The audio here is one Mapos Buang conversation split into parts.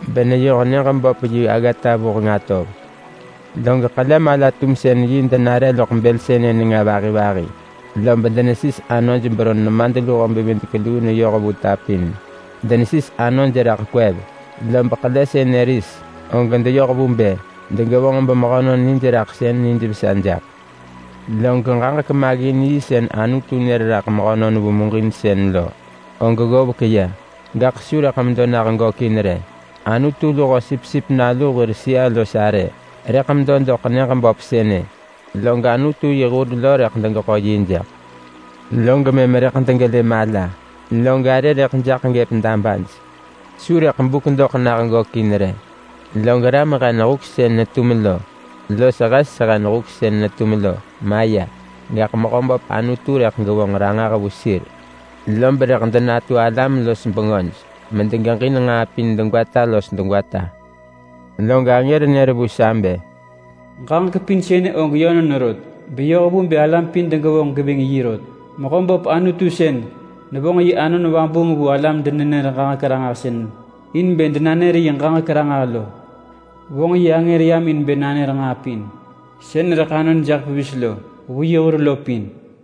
beneyoh nyëġ böp yi aggata vuheng atov. Log ḳele mala-tumsën-yi denare loḳ bël sënë nenga vahi vahi. Lob denesis anoj beron nemadluho-bevidek-luu neyoh vu ta pin. Denesis anoj raḳ kwev. Lob ḳele sënë ris, og deyoh vu bë degevonġ bemehönon nijraḳsën nijvesa jaḳ. Log ġaġek maggin-yi sën Anutu nër raḳ mehönon vu muġinsën lo, og ggovek ya. Gaḳ su rëḳ medo nah gökin rë. Anutu luho Sipsip Nalu hir sëa-los-arë rëḳ medo doḳ nyëġ böp sënë. Log Anutu yi hur lo rëḳ degeḳo yi jaḳ. Log mëm rëḳ degelë mala. Log arë rëḳ jaḳ gëp dabaj. Su rëḳ buk doḳ nah gökin rë. Log ram hen huk sën netum lo, los hes hen huk sën netum lo maya. Gaḳ Mehöböp Anutu rëḳ gevonġ ranġah vu sir. Lob rëḳ denatu alam-los-bengöj medegeġin nġaa pin degwata los degwata. Log angër nër vu sa bë, “Ġaġek pin sënë og yönon rot, beyoh vu bë alam pin degevonġ geving yi rot. Mehöböp Anutu sën nevonġ yi Anon Vabuung vu alam-denenër-ġaġek-ranġahsën in bë denanër yi ġaġek ranġah lo, vonġ yi angër yam in bë nanër nġaa pin sën rëḳ anon jaḳ pevis lo vu yi hur lo pin.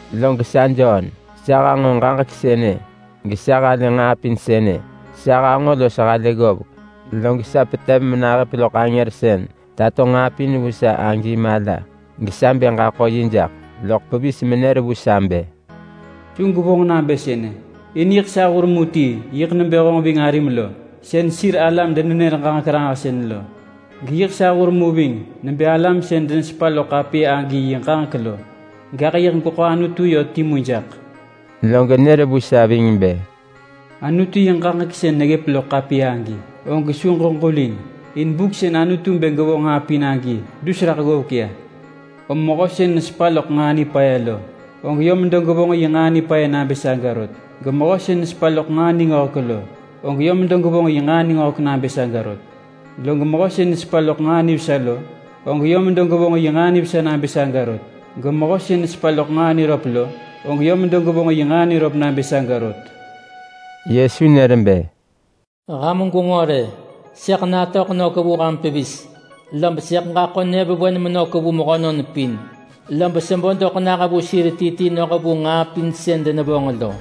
Log sa Jon, sa hanġo ġaġek sënë, gesa halë nġaa pin sënë. Sa hanġo los halë ggovek, log sa petev menahëp loḳ angër sën tato nġaa pin vu sa agi mala, gesa bë ġaḳo yi jaḳ. Loḳ pevis menër vu sa bë, “Su gwevonġ nabë sënë! In sa hur ti yiḳ nebë honġ ving arim lo sën sir alam-denenër-ġaġek-ranġahsën lo. Geyiḳ hur mu sa nebë alam sën denesepa loḳ ḳapiya agi yi ġaġek lo. Gaḳ yiḳ gweḳo Anutu yö timu jaḳ.” Lob nër vu sa ving bë, “Anutu yi ġaġek sën neggëp loḳ ḳapiya agi, og su ġeġulin, in buk sën Anutu bë gevonġ nġaa pin agi dus raḳ ggovek ya. Om mehö sën nesepa loḳ nġaa nipaya lo, og yö medo gevonġ yi nġaa nipaya nabë saga rot. Gemehö sën nesepa loḳ nġaa ningöhek lo, og yö medo gevonġ yi nġaa ningöhek nabë saga rot. Log mehö sën nesepa loḳ nġaa nivesa lo, og yö medo gevonġ yi nġaa nivesa nabë saga rot. Gemehö sën nesepa loḳ nġaa niröp lo, og yö medo gevonġ yi nġaa niröp nabë saga rot.” Yesu nër bë, “Ham gwenġo rë! Sëḳ natöḳ nök vu ham pevis. Lob sëḳ ġaḳo nyëvewen menök vu mehönon pin, lob sebo doḳ nah vu sir ti ti noh vu nġaa pin sën denevonġ lo.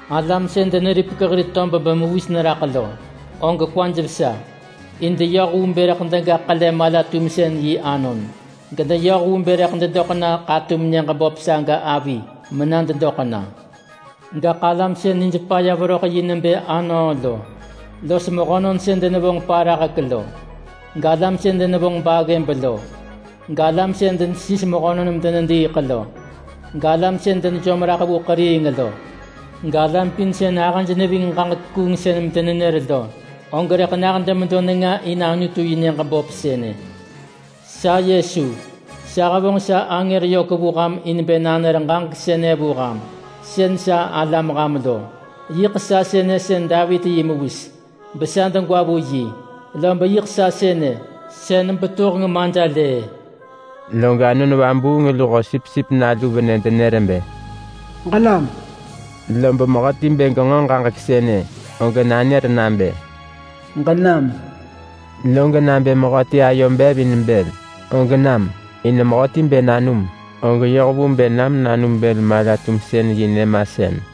Alam sën deneripek hir tob bemewis neraḳ lo, og kwaj vesa, in deyoh vu bë rëḳ dega ḳele mala-tumsën-yi anon. Gedeyoh vu bë rëḳ dedoḳ na ḳatum nyëġ böp saga avi mena dedoḳ na. Gaḳ alam sën nij paya veröḳ yi nebë anöö lo, los mehönon sën denevonġ parahek lo, galam sën denevonġ baggëb lo, galam sën denesis mehönon medenediiḳ lo, galam sën denejom raḳ vu ḳeriing lo, galam pin sën ahëj neving ġaġek kuungsën medenenër lo, og rëḳ nah demedo nenga in Anutu yi nyëġ böp sënë. Sa Yesu, sa hevonġ sa angër yök vu ham in bë nanër ġaġek sënë vu ham sën sa alam ham lo. Yiḳ sa sënë sën Davit yi mewis, besa degwa vu yi. Lob yiḳ sa sënë sën Betuheng Majelëë.” Log Anon Vabuung luho Sipsip Nalu venë denër bë, “Ġenam!” Lob mehöti bë genġo ġaġek sënë, og nanër nabë, “Ġenam!” Log nabë mehöti ayo bev in bël, og nam, in mehöti bë nanum, og yoh vu bë nam nanum bël-mala-tumsën-yi nyëmasën.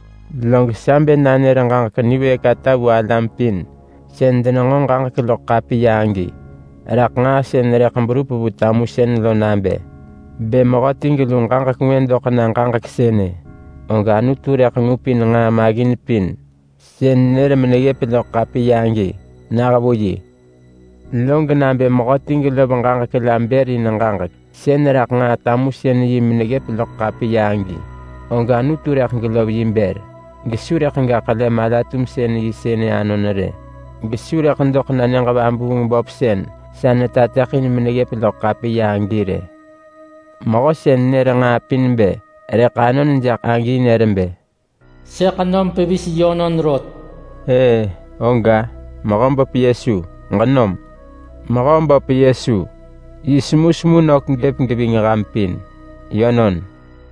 Log sa bë nanër ġaġek niwëëk ata vu alam pin sën denenġo ġaġek loḳ ḳapiya agi, raḳ nġaa sën rëḳ berup vu tamusën lo nabë: Bë mehöti gelu ġaġek ngwë doḳ na ġaġek sënë, og Anutu rëḳ ngupin nġaa maggin pin sën nër meneggëp loḳ ḳapiya agi nah vu yi. Lob nabë mehöti gelov ġaġek la bër in ġaġek sën raḳ nġaa tamusën-yi meneggëp loḳ ḳapiya agi, og Anutu rëḳ gelov yi bër gesu rëḳ ga ḳele mala-tumsën-yi sënë anon rë. Gesu rëḳ doḳ na nyëġ vabuung böp sën sa netateḳin meneggëp loḳ ḳapiya agi rë. Mehö sën nër nġaa pin bë rëḳ anon jaḳ agi nër bë, “Sëḳ nom pevis yönon rot!” Ëë, oga! Mehöböp Yesu, ġenam! Mehöböp Yesu yi semusemu nök gëp geving ham pin. Yönon.